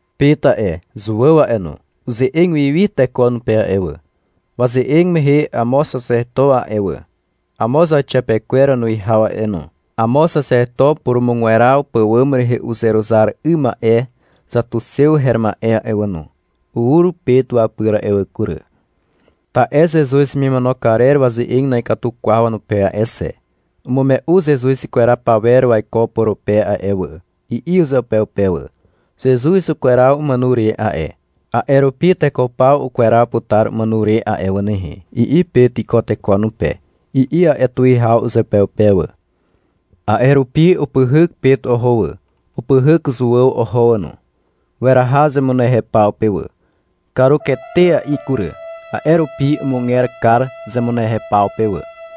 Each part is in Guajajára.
Pet a'e, Zuàw a'e no, uze'eg wi wi teko wanupe a'e wà. Waze'eg mehe amo xaxeto a'e wà, amo zauxiapekwer wanuwihaw a'e no, amo xaxeto purumugweraw pàwàm rehe uzeruzar 'ym ma'e xatuxew her ma'e a'e wà no, ur Pet wapyr a'e wà kury. Ta'e Zezuz hemimono karer waze'eg na'ikatu kwaw wanupe a'e xe. -Umume'u Zezuz ikweraw pawer waiko purupe a'e wà, i'i uzeupeupe wà. — Zezuz ukweraw umàno re a'e, a'e rupi teko paw ukweraw putar umàno re a'e wà nehe, i'i Pet iko teko wanupe, i'i a'e tuwihaw uzeupeupe wà. A'e rupi upyhyk Pet oho wà, upyhyk Zuàw oho wà no. Weraha zemunehew paw pe wà. Karuketea'i kury, a'e rupi umuger kar zemunehew paw pe wà.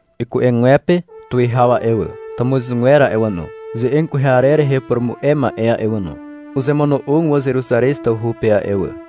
Iku'egwepe tuwihaw a'e wà, tàmuzgwer a'e wà no, ze'eg kwehe arer rehe upurumu'e ma'e a'e wà no, uzemono'og wà Zeruzarez tawhu pe a'e wà.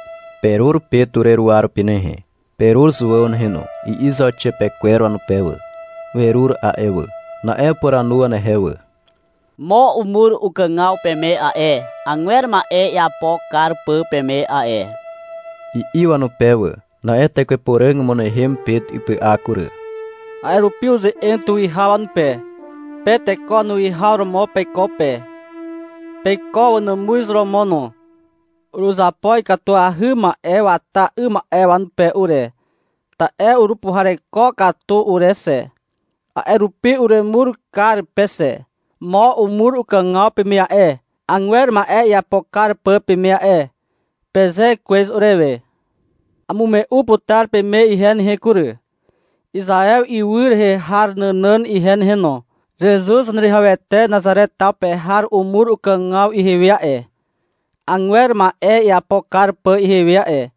— Perur Pet ureruwa rupi nehe, perur Zuàw nehe no, i'i zauxiapekwer wanupe wà. (Werur a'e wà.) Na'e upuranu wanehe wà. — Mo umur ukàgaw peme a'e, agwer ma'e iapo kar pà peme a'e, i'i wanupe wà. Na'e Tekwe Puràg umynehem Pet ipy'a kury. A'e rupi uze'eg tuwihaw wanupe. -Pe teko wanuwihaw romo peiko pe. Peiko wanàmuz romo no. Uruzapo ikatuahy ma'e wata 'ym ma'e pe ure, ta'e urupuhareko katu ure xe. A'e rupi uremur kar pe xe. — Mo umur ukàgaw peme a'e, agwer ma'e iapo kar pà peme a'e, peze kwez urewe. Amume'u putar peme ihe nehe kury, Izaew ywy rehe har nànàn ihe nehe no. Zezuz Zaneruwihawete Nazare taw pe har umur ukàgaw ihewe a'e, agwer ma'e iapo kar pà ihewe a'e.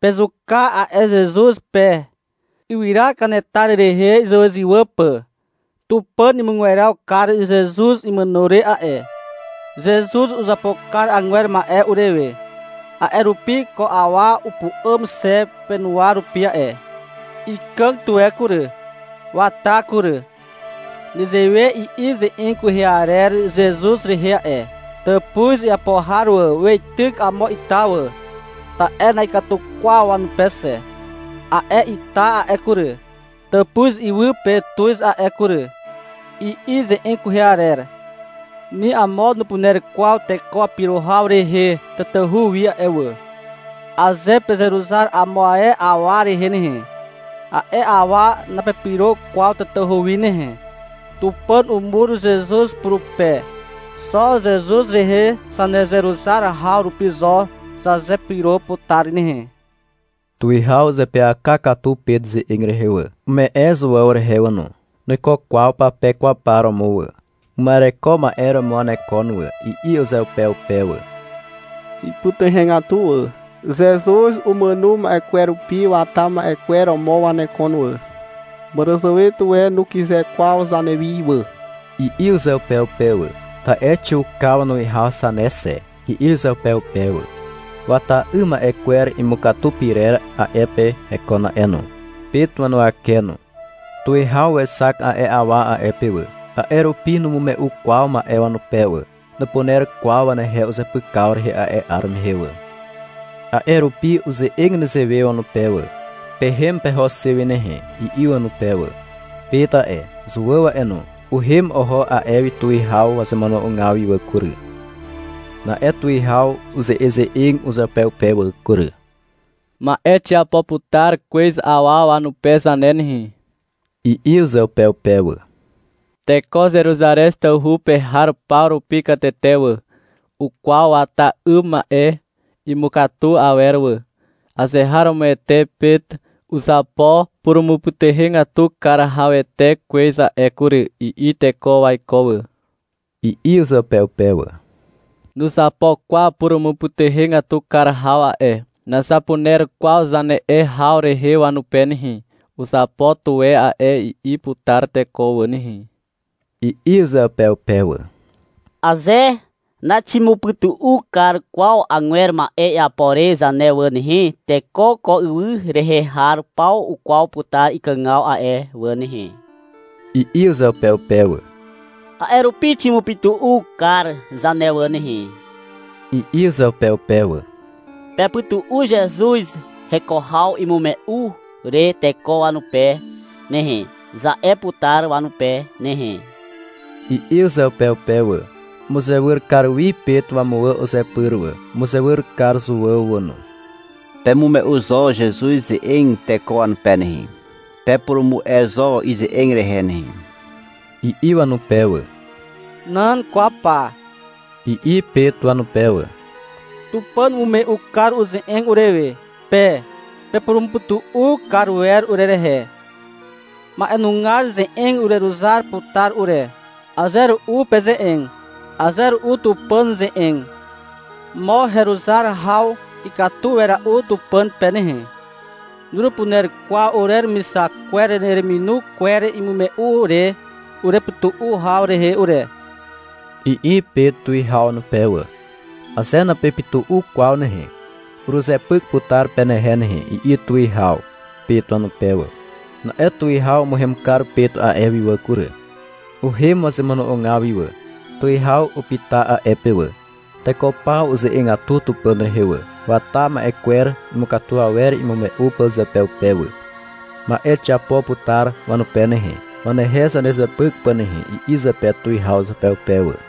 Pezuka a'e Zezuz pe, ywyra kanetar rehe izywàzywà pà. Tupàn umugweraw kar Zezuz imàno re a'e. Zezuz uzapo kar agwer ma'e urewe. A'e rupi ko awa upu'àm xe penuwa rupi a'e. Ikàg tuwe kury. Wata kury. Nezewe i'i ze'eg kwehe arer Zezuz rehe a'e. Tàpuz iapo har wà Weityk amo ita wà, Ta'e na'ikatu kwaw wanupe xe. A'e ita a'e kury, Tàpuz iwy pe tuz a'e kury, i'i ze'eg kwehe arer. Ni amo nupuner kwaw teko wapyro haw rehe tatahu wi a'e wà. Aze pezeruzar amo ae awa rehe nehe, a'e awa napepyro kwaw tatahu wi nehe. Tupàn umur Zezuz purupe. Xo Zezuz rehe zanezeruzar haw rupi zo zazepyro putar nehe. Tuwihaw uzeapyaka katu Pet ze'eg rehe wà. Ume'e Zuàw rehe wà no. — Nuiko kwaw pape kwaw par romo wà. Uma'ereko ma'e romo wanekon wà, i'i uzeupeupe wà. Ipytuhegatu wà. — Zezuz umàno ma'e kwer rupi wata ma'e kwer romo wanekon wà. Màràzàwe tuwe nukyze kwaw zanewi wà, i'i uzeupeupe wà. (Ta'e xiuka wanuwihaw zane xe, i'i uzeupeupe wà.) Wata 'ym ma'e kwer imukatu pyrer a'e pe hekon a'e no, Pet wanuwake no. Tuwihaw wexak a'e awa a'e pe wà. A'e rupi numume'u kwaw ma'e wanupe wà. Nupuner kwaw wanehe uzepykaw rehe a'e 'ar mehe wà. A'e rupi uze'eg nezewe wanupe wà. — Pehem peho xe wi nehe, i'i wanupe wà. Pet a'e, Zuàw a'e no, uhem oho a'e wi tuwihaw wazemono'ogaw wi wà kury. Na'e tuwihaw uze'eze'eg uzeupeupe wà kury. — Ma'e xiapo putar kwez awa wanupe zane nehe, i'i uzeupeupe wà. — Teko Zeruzarez tawhu pe har paw rupi katete wà, ukwaw wata 'ym ma'e imukatu awer wà. — Azeharomoete Pet uzapo purumupytuhegatu kar hawete kwez a'e kury, i'i teko waiko wà, i'i uzeupeupe wà. — Nuzapo kwaw purumupytuhegatu kar haw a'e, nazapuner kwaw zane'e haw rehe wanupe nehe. — Uzapo tuwe a'e, i'i putar teko wà nehe, i'i uzeupeupe wà. — Aze naximupytu'u kar kwaw agwer ma'e iapo re zane wà nehe, teko ko ywy rehe har paw ukwaw putar ikàgaw a'e wà nehe, i'i uzeupeupe wà. — A'e rupi ximupytu'u kar zane wà nehe, i'i uzeupeupe wà. — Pepytu'u Zezuz heko haw imume'u re teko wanupe nehe, za'e putar wanupe nehe, i'i uzeupeupe wà. Umuzewyr kar wi Pet wamuwà uzepyr wà, umuzewyr kar Zuàw wà no. — Pemume'u zo Zezuz ze'eg teko wanupe nehe, pepurumu'e zo ize'eg rehe nehe, i'i wanupe wà. — Nan kwaw pa, i'i Pet wanupe wà. — Tupàn umume'u kar uze'eg urewe. Pe pepurumupytu'u kar wer urerehe. Ma'enugar ze'eg ureruzar putar ure. Aze ru'u peze'eg. Aze ru'u Tupàn ze'eg. Mo heruzar haw ikatu wera'u Tupàn pe nehe. Nurupuner kwaw ureremixak kwer urereminu kwer imume'u re urepytu'u haw rehe ure, i'i Pet tuwihaw wanupe wà. — Aze napepytu'u kwaw nehe, uruzepyk putar penehe nehe, i'i tuwihaw, Pet wanupe wà. Na'e tuwihaw umuhem kar Pet a'e wi wà kury. Uhem wazemono'ogaw wi wà. Tuwihaw upyta a'e pe wà. Teko paw uze'egatu Tupàn rehe wà, wata ma'e kwer imukatu awer imume'u pà uzeupeupe wà. — Ma'e xiapo putar wanupe nehe, wanehe zanezepyk pà nehe, i'i zepe tuwihaw uzeupeupe wà.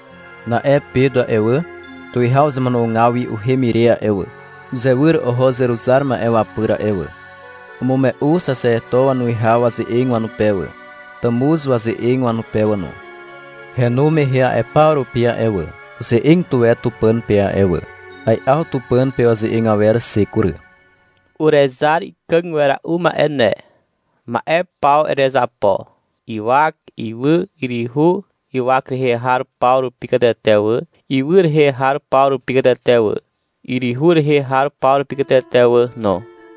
Na'e Pet a'e wà, tuwihaw wazemono'ogaw wi uhem ire a'e wà, uzewyr oho uzeruzar ma'e wapyr a'e wà. Umume'u xaxeto wanuwihaw waze'eg wanupe wà, tàmuz waze'eg wanupe wà no. Henu mehe a'e paw rupi a'e wà, uze'eg tuwe Tupàn pe a'e wà. Ai'aw Tupàn pe waze'eg awer xe kury. -Urezar ikàg wera'u ma'e ne. Ma'e paw erezapo: ywak, ywy, yryhu, ywak rehe har paw rupi katete wà, ywy rehe har paw rupi katete wà, yryhu rehe har paw rupi katete wà no.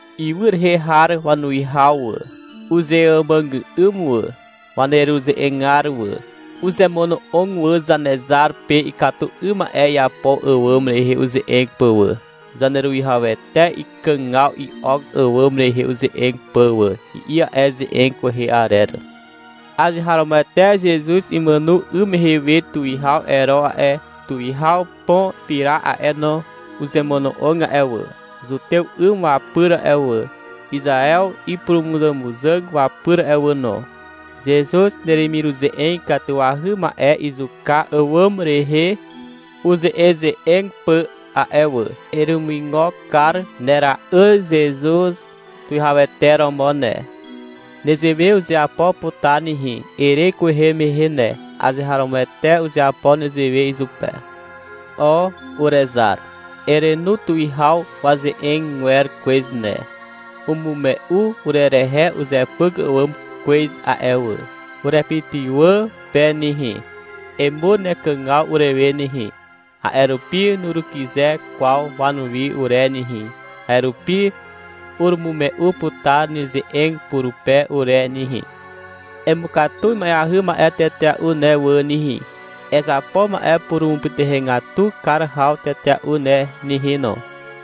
Ywy rehe har wanuwihaw wà, uzemuàgà'ym wà. Waneruze'egar wà, uzemono'og wà Zanezar pe ikatu 'ym ma'e iapo àwàm rehe uze'eg pà wà, Zaneruwihawete ikàgaw i'ok àwàm rehe uze'eg pà wà, i'i a'e ze'eg kwehe arer. Azeharomoete Zezuz imàno 'ym mehe we Tuwihaw Ero a'e, Tuwihaw Pon Pirat a'e no, uzemono'og a'e wà, zutew 'ym wapyr a'e wà, Izaew ipurumuzàmuzàg wapyr a'e wà no. Uzemono'og taw pe wà, Zezuz neremiruze'eg ikatuahy ma'e izuka àwàm rehe uze'eze'eg pà a'e wà. Eremuigo kar nera'yr Zezuz Tuwihawete romo ne. Nezewe uzeapo putar nehe, ere kwehe mehe ne. Azeharomoete uzeapo nezewe izupe. O, urezar, erenu tuwihaw waze'eg awer kwez ne. Umume'u urerehe uzepyk àwàm kwez a'e wà. Urepytywà pe nehe, emur nekàgaw urewe nehe, a'e rupi nurukyze kwaw wanuwi ure nehe, a'e rupi urumume'u putar neze'eg purupe ure nehe. Emukatu ima'eahy ma'e tetea'u ne wà nehe. Ezapo ma'e purumupytuhegatu kar haw tetea'u ne nehe no,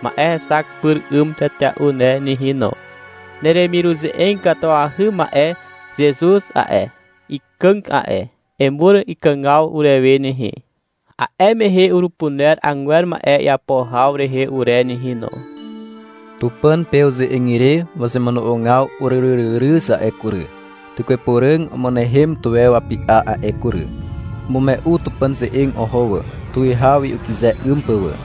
ma'e hexak pyr 'ym tetea'u ne nehe no. Neremiruze'eg ikatuahy ma'e Zezuz a'e, ikàg a'e. Emur ikàgaw urewe nehe. A'e mehe urupuner agwer ma'e iapo haw rehe ure nehe no. Tupàn pe uze'eg ire wazemono'ogaw uryryryryz a'e kury. Tekwe Puràg umynehem tuwe wapy'a a'e kury. Umume'u Tupàn ze'eg oho wà, tuwihaw wi ukyze 'ym pà wà.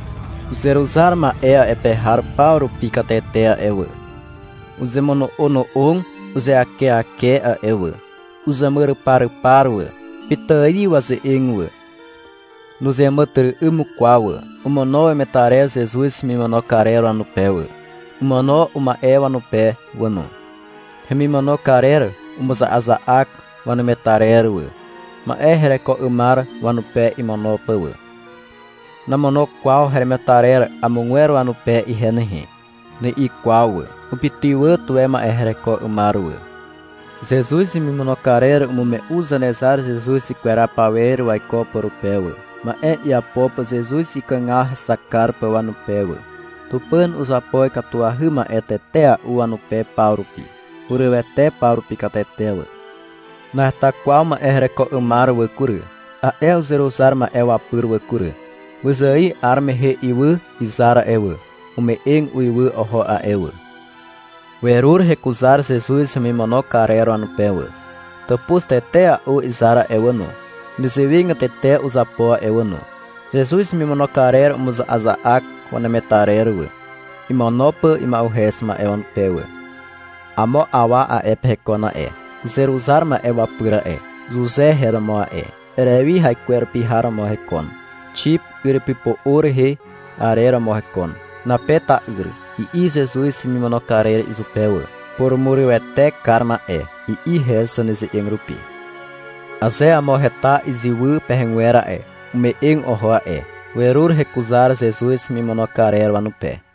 Uzeruzar ma'e a'e pe har paw rupi katete a'e wà, uzemono'ono'og uzeakeake a'e wà, uzemuryparypar wà. Pitài waze'eg wà. Nuzeàmàtyry'ym kwaw wà. Omono wemetarer Zezuz hemimono karer wanupe wà, omono uma'e wanupe wà no. Hemimono karer umuza'aza'ak wanemetarer wà, ma'e hereko 'ymar wanupe imono pà wà. — Namono kwaw heremetarer amogwer wanupe ihe nehe, ni'i kwaw wà. Upytywà tuwe ma'e hereko 'ymar wà. Zezuz hemimono karer umume'u Zanezar Zezuz ikweraw pawer waiko purupe wà, ma'e iapo pà Zezuz ikàgaw hexak kar pà wanupe wà. Tupàn uzapo ikatuahy ma'e tetea'u wanupe paw rupi. Hurywete paw rupi katete wà. Naheta kwaw ma'e hereko 'ymar wà kury, a'e uzeruzar ma'e wapyr wà kury. Wyzài 'ar mehe ywy izar a'e wà, ume'eg uiwy oho a'e wà. Werur hekuzar Zezuz hemimono karer wanupe wà. Tàpuz tetea'u izar a'e wà no, nezewegatete uzapo a'e wà no. Zezuz hemimono karer umuza'aza'ak wanemetarer wà, imono pà ima'uhez ma'e wanupe wà. Amo awa a'e pe hekon a'e, uzeruzar ma'e wapyr a'e. Zuze her romo a'e. Erewi haikwerupi har romo hekon. Xip yrypypo'o rehe arer romo hekon. (— Nape ta'yr, i'i Zezuz hemimono karer izupe wà. — Purumurywete kar ma'e, i'i her zaneze'eg rupi.) Aze amo heta iziwy pegwer a'e, ume'eg oho a'e. Werur hekuzar Zezuz hemimono karer wanupe.